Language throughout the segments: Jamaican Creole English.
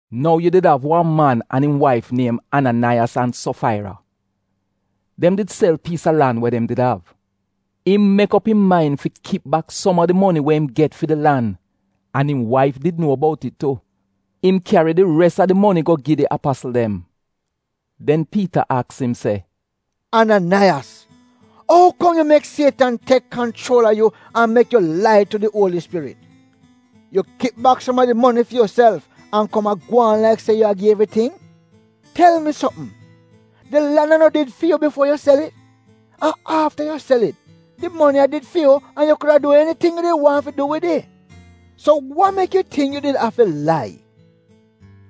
Nou yu did av wan man an im waif niem Ananaiyas an Sofaira. Dem did sel piis a lan we dem did av. Im mek op im main fi kip bak som a di moni we im get fi di lan, an im waif did nuo bout it. Im kyari di res a di moni go gi di apasl dem. Den Piita aks im se, “Ananaiyas, ou kom yu mek Sietan tek kanchuol a yu an mek yu lai tu di Uoli Spirit? Yu kip bak som a di moni fi yuself, an kom a gwaan laik se yu a gi evriting? Tel mi sopm, di lan a no did fi yu bifuo yu sel it? An afta yu sel it, di moni a did fi yu an yu kuda du eniting we yu did waahn fi du wid it. So wa mek yu tingk yu did afi lai?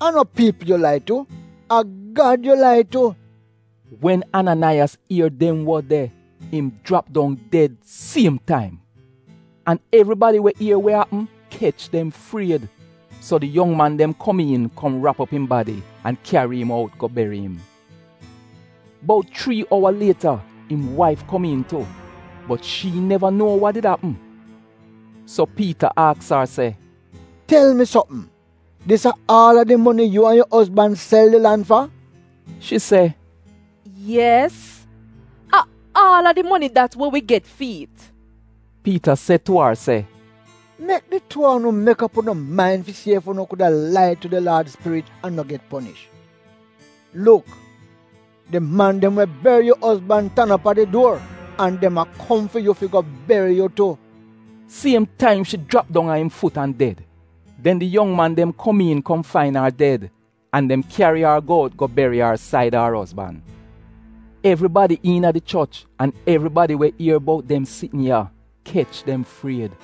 A no piipl yu a lai tu, a Gad yu lai tu.” Wen Ananaiyas ier dem wod de im jrap dong ded siem taim. An evribadi we ier we apm kech dem fried. So di yong man dem komiin kom rap op im badi an kyari im out go beri im. Bout chrii owa lieta im waif komiin tu, bot shi neva nuo wa did apm. So Piita aks ar se, “Tel mi sopm, dis a aal a di moni yu an yu ozban sel di lan fa?” Shi se, “Yes! A aal a di moni dat we wi get fi'it.” Piita se tu ar se, “Mek di tuu a unu mek op unu main fi si ef unu kuda lai tu di Laad Spirit an no get ponish? Luk! Di man dem we beri yu ozban tan op a di duor, an dem a kom fi yu fi go beri yu tu.” Siem taim shi jrap dong a im fut an ded. Den di yong man dem kom iin kom fain ar ded an dem kyari ar out go beri ar saida ar ozban. Evribadi iina di choch an evribadi we ier bout dem sitn ya kech dem fried.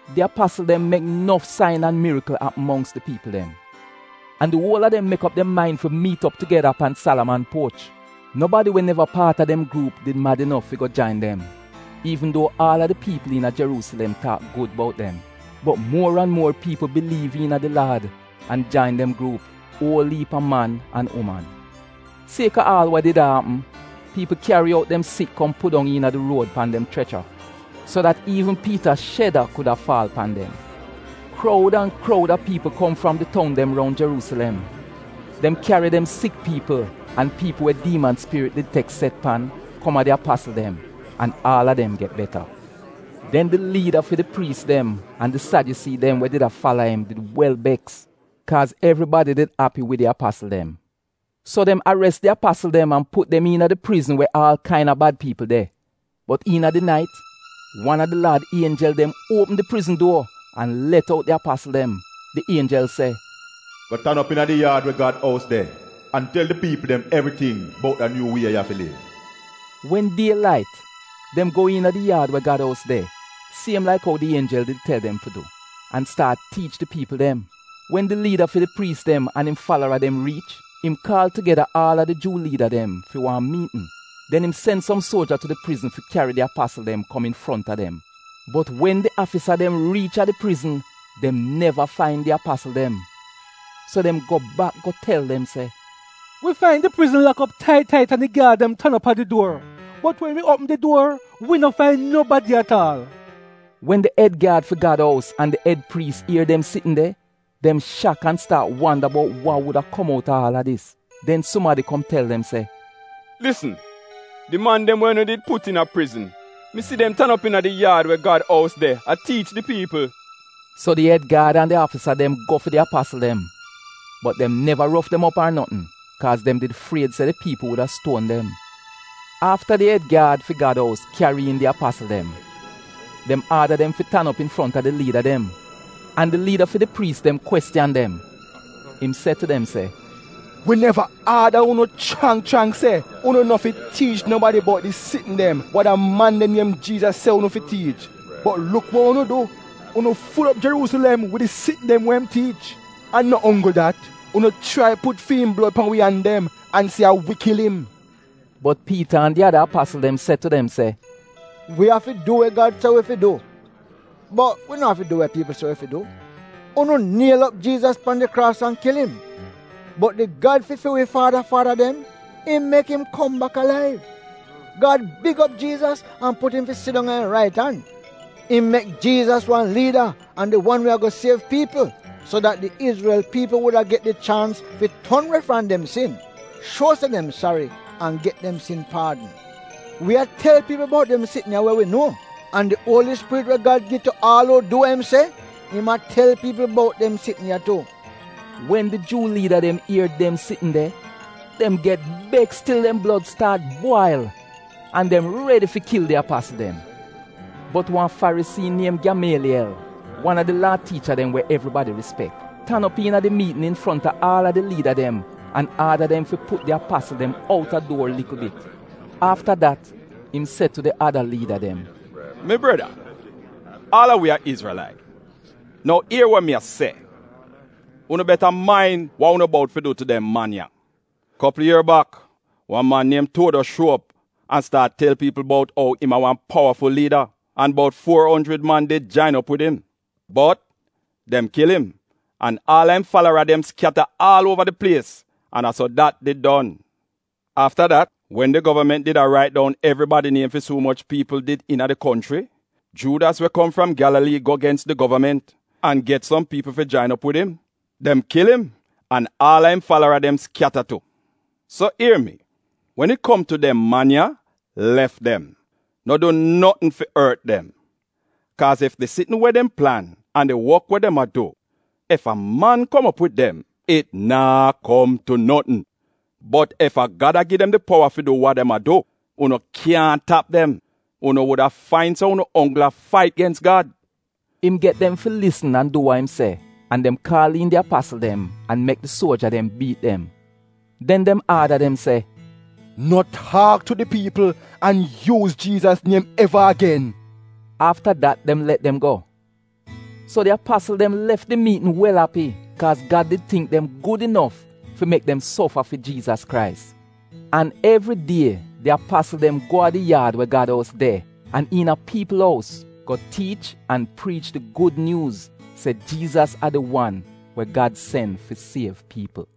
Di apasl dem mek nof sain an mirikl apm mongks di piipl dem. An di uol a dem mek op dem main fi miit op tugeda pan Salaman Puoch. Nobadi we neva paat a dem gruup did mad inof fi go jain dem, iivn duo aal a di piipl iina Jeruusilem taak gud bout dem. Bot muor an muor piipl biliiv iina di Laad an jain dem gruup, uol iip a man an uman. Kaaz a aal wa did a apm, piipl kyari out dem sik kom pudong iina di ruod pan dem chrecha so dat iivn Piita sheda kuda faal pan dem. Kroud an kroud a piipl kom fram di toun dem roun Jeruusilem. Dem kyari dem sik piipl an piipl we diiman spirit did tek set pan kom a di apasl dem an aal a dem get beta. Den di liida fi di priis dem an di Sadyusii dem we did a fala im did wel beks kaaz evribadi did api wid di apasl dem. So dem ares di apasl dem an put dem iina di prizn we aal kaina bad piipl de. Bot iina di nait wan a di Laad ienjel dem uopm di prizn duor an let out di apasl dem. Di ienjel se, “Go tan op iina di yaad we Gad ous de an tel di piipl dem evriting bout da nyuu wie ya fi liv.” Wen die lait dem go iina di yaad we Gad ous de, siem laik ou di ienjel did tel dem fi du, an staat tiich di piipl dem. Wen di liida fi di priis dem an im falara dem riich, im kaal tugeda aal a di Juu liida dem fi wan miitn. Den im sen som suoja tu di prizn fi kyari di apasl dem kom infronta dem. Bot wen di afisa dem riich a di prizn, dem neva fain di apasl dem. So dem go bak go tel dem se, “Wi fain di prizn lak op tait, tait an di gyaad dem tan op a di duor, bot wen wi uopm di duor, wi no fain nobadi at aal.” Wen di ed gyaad fi Gad ous an di ed priis ier dem sitn de, dem shak, an staat wanda bout wa wuda kom out a aal a dis. Den sumadi kom tel dem se, “Lisn! Di man dem we unu did put iina prizn, mi si dem tan op iina di yaad we Gad ous de a tiich di piipl!” So di ed gyaad an di afisa dem go fi di apasl dem. Bot dem neva rof dem op ar notn, kaaz dem did fried se di piipl wuda stuon dem. Afta di ed gyaad fi Gad ous kyari iin di apasl dem, dem aada dem fi tan op infronta di liida dem, an di liida fi di priis dem kwestiyan dem. Im se tu dem se, “Wi neva aada unu chrang chrang se unu no fi tiich nobadi bout di sitn dem we da man de niem Jiizas se unu fi tiich? Bot luk wa unu du. Unu ful op Jeruusilem wid di sitn dem we im tiich. An no onggl dat, unu chrai put fi'im blod pan wi an dem an se a wi kil im.” Bot Piita an di ada apasl dem se tu dem se, “Wi afi du we Gad se wi fi du, bot wi no afi du wa piipl se wi fi du. Unu niel op Jiizas pan di kraas an kil im, bot di Gad fi fi wi faada faada dem, im mek im kom bak alaiv. Gad big op Jiizas an put im fi sidong a im rait an. Im mek Jiizas wan liida an di wan we ago siev piipl so dat di Izrel piipl wuda get di chaans fi ton we fram dem sin, shuo se dem sari, an get dem sin paadn. Wi a tel piipl bout dem sitn ya we wi nuo, an di Uoli Spirit we Gad gi tu aal uu du we im se, im a tel piipl bout dem sitn ya tu.” Wen di Juu liida dem ier dem sitn de, dem get beks til dem blod staat bwail an dem redi fi kil di apasl dem. Bot wan Farisii niem Gyamaaliyel, wan a di Laa tiicha dem we evribadi rispek, tan op iina di miitn infronta aal a di liida dem an aada dem fi put di apasl dem outa duor likl bit. Afta dat im se tu di ada liida dem, “Mi breda aal a wi a Izrelait. Nou ier wa mi a se, unu beta main wa unu bout fi du tu dem man ya. Kopl ier bak wan man niem Tuodos shuo op an staat tel piipl bout ou im a wan powaful liida an bout fuo onjrid man did jain op wid im. Bot dem kil im, an aal a im falara dem skyata aal uova di plies an a so dat did don. Afta dat wen di govament did a rait dong evribadi niem fi si umoch piipl did iina di konchri, Juudas we kom fram Gyalalii go gens di govament an get som piipl fi jain op wid im. Dem kil im an aal a im falara dem skyata tu. So ier mi, wen it kom tu dem man ya lef dem, no du notn fi ort dem. Kaaz ef di sitn we dem plan an di wok we dem a du, ef a man kom op wid dem, it naa kom tu notn. Bot ef a Gad a gi dem powa fi du wa dem a du, unu kyaahn tap dem; unu wuda fain se unu onggl a fait gens Gad.” Im get dem fi lisn an du wa im se an dem kaal iin di apasl dem an mek di suoja dem biit dem. Den dem aada dem se, “No taak tu di piipl an yuuz Jiizas niem eva agen!” Afta dat dem let dem go. So di apasl dem lef di miitn wel api kaaz Gad did tingk dem gud inof fi mek dem sofa fi Jiizas Krais. An evridie di apasl dem go a di yaad we Gad ous de an iina piipl ous go tiich an priich di Gud Nyuuz se Jiizas a di wan we Gad sen fi siev piipl.